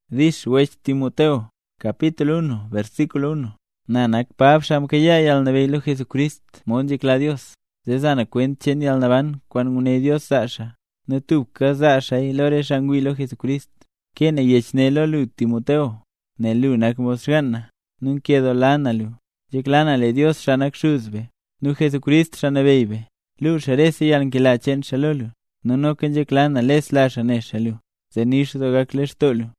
Dix Wech Timoteo. Na nak Pab, xaa mkayaa yalnabeyy lo Jesucrist mod nzhekla Dios, zee za na kwent cheen yalnaban kwaan nguné Dios zaa xaa, nu tubka zaa xaaya lo re xaa ngwii lo Jesucrist. Kee na yech ne lo lu Timoteo, nel lu nak mod xgaan na, nu nkedoola na lu. Nzhekla na lee Dios, xaa nak xuz be, nu Jesucrist, Xaa Nabeyy be, luu xaa rese yalnkela cheen xaa lo lu, nu noka nzhekla na lesla xaa ne xaa lu, zee nix doo gak lextoo lu.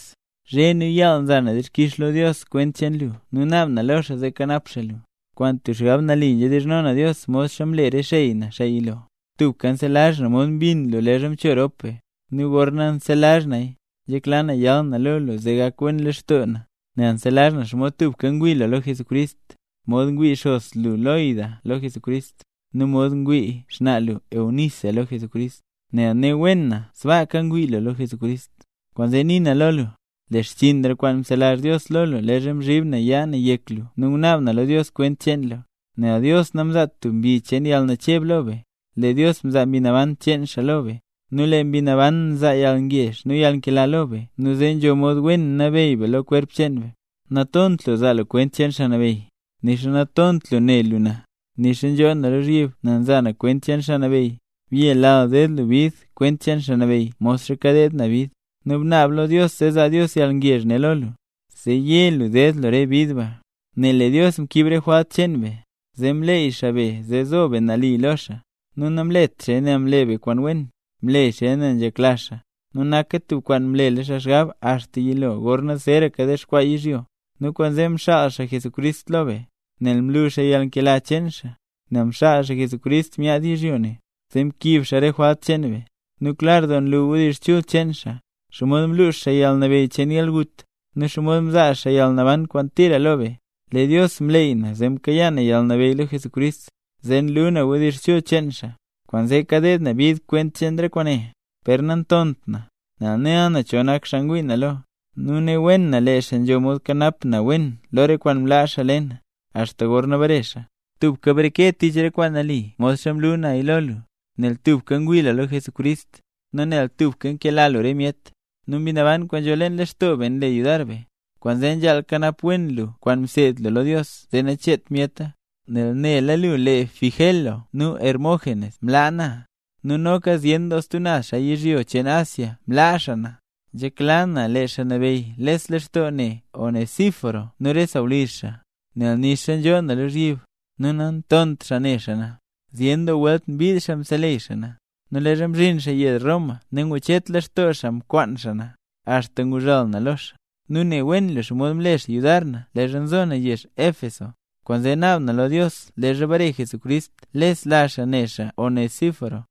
Zhe nu yaal nza na dixkix lo Dios kwent cheen lu nu naab na lo xaa zee kanap xaa lu. Kwaan tub xgab nali nzhedizhno na Dios modxa mle re xey na, xaa yilo. Tubka nselazh na mod mbinn lu leezha mcho rop be, nu gorna nselazh naya, nzhekla na yal na lo lu zee gak wen lextoo na. Nel nselazh na xomod tubka ngwii lu lo Jesucrist, mod ngwii xos lu, Loida lo Jesucrist, nu mod ngwii xnaa lu, Eunice lo Jesucrist. Nu ne wen na sbaaka ngwii lu lo Jesucrist. Kwaanzee nii na lo lu, le xchiinra kwaan mzelazh Dios lo lu leezha mzhib na yaa na yek lu nu ngunaab na lo Dios kwent cheen lu. Nel Dios namzaat tub mbi cheen yalnacheb lo be, lee Dios mzaa Mbi Naban cheen xaa lo be, nu lee Mbi Naban nzaa yalngezh nu yalnkela lo be nu zee nzho mod wen nabeyy be lo kwerp cheen be. Natont lu zaa lu kwent cheen Xaa Nabeyy, nixa natont lu ne lu na, nixa nzhoo na lozhyib nel nza na kwent cheen Xaa Nabeyy. Byelal ded lu bid kwent cheen Xaa Nabeyy modxa kadeed na bid, nu bnaab lo Dios zee zaa Dios yalngezh ne lo lu, zee ye lu ded lu re bid ba. Nel lee Dios mkiib re jwalt cheen be, zee mleey xaa be zee zo be nali lo xaa. Nu namlet xaaya nel mle be kwaan wen, mle xaaya nel nzhekla xaa, nu naka tub kwaan mlela xaa xgab axta yilo gorna zeeraka dexkwaa yizhyo, nu kwaanzee mxaal xaa Jesucrist lo be. Nel mlu xaa yalnkela cheen xaa, nel mxaal xaa Jesucrist myaad yizhyo ne, zee mkiib xaa re jwalt cheen be. Nu klar doo nlu wdizh chul cheen xaa, xomod mlux xaa yalnabeyy cheen yalgut, nu xomod mzaa xaa yalnaban kwaan tira lo be. Lee Dios mleey na zee mkayaa na yalnabeyy lo Jesucrist, zee nlu na wdizh chul cheen xaa, kwaanzee kadeed na bid kwent cheen re kwaane. Per nantont na, nel nela na cho nak xaa ngwii na lo, nu ne wen na lee xaa nzho mod kanap na wen wen lo re kwaan mlaa xaa le na, axta gorna bare xaa. Tubka breke tich kwaan nali modxa mlu naya lo lu; nel tubka ngwii lu lo Jesucrist, nu nel tubka nkela lu re myet. Nu Mbi Naban kwaan nzho leen lextoo be nle yudar be; kwaanzee nzhaal kanap wen lu kwaan mseed lu lo Dios zee nacheet myeta. Nel nela lu lee wech Figelo nu wech Hermógenes mlaa na, nu noka zyen doo stub naz xaa yizhyo cheen Asia mlaa xaa na. Nzhekla na lee Xaa Nabeyy les lextoo ne Onesíforo nu re sawlizh xaa, nel nixa nzhoo na lozhyib, nu nantont xaa ne xaa na. Zyen doo welt mbiid xaa mseleyy xaa na. Nu leezha mzhin xaa yezh Roma nangucheet lextoo xaa mkwaan xaa na, axta nguzhal na lo xaa. Nu ne wen lu xomod mle xaa yudar na leezha nzo na yezh Éfeso. Kwaanzee naab na lo Dios leezha bare Jesucrist lesla xaa ne xaa Onesíforo.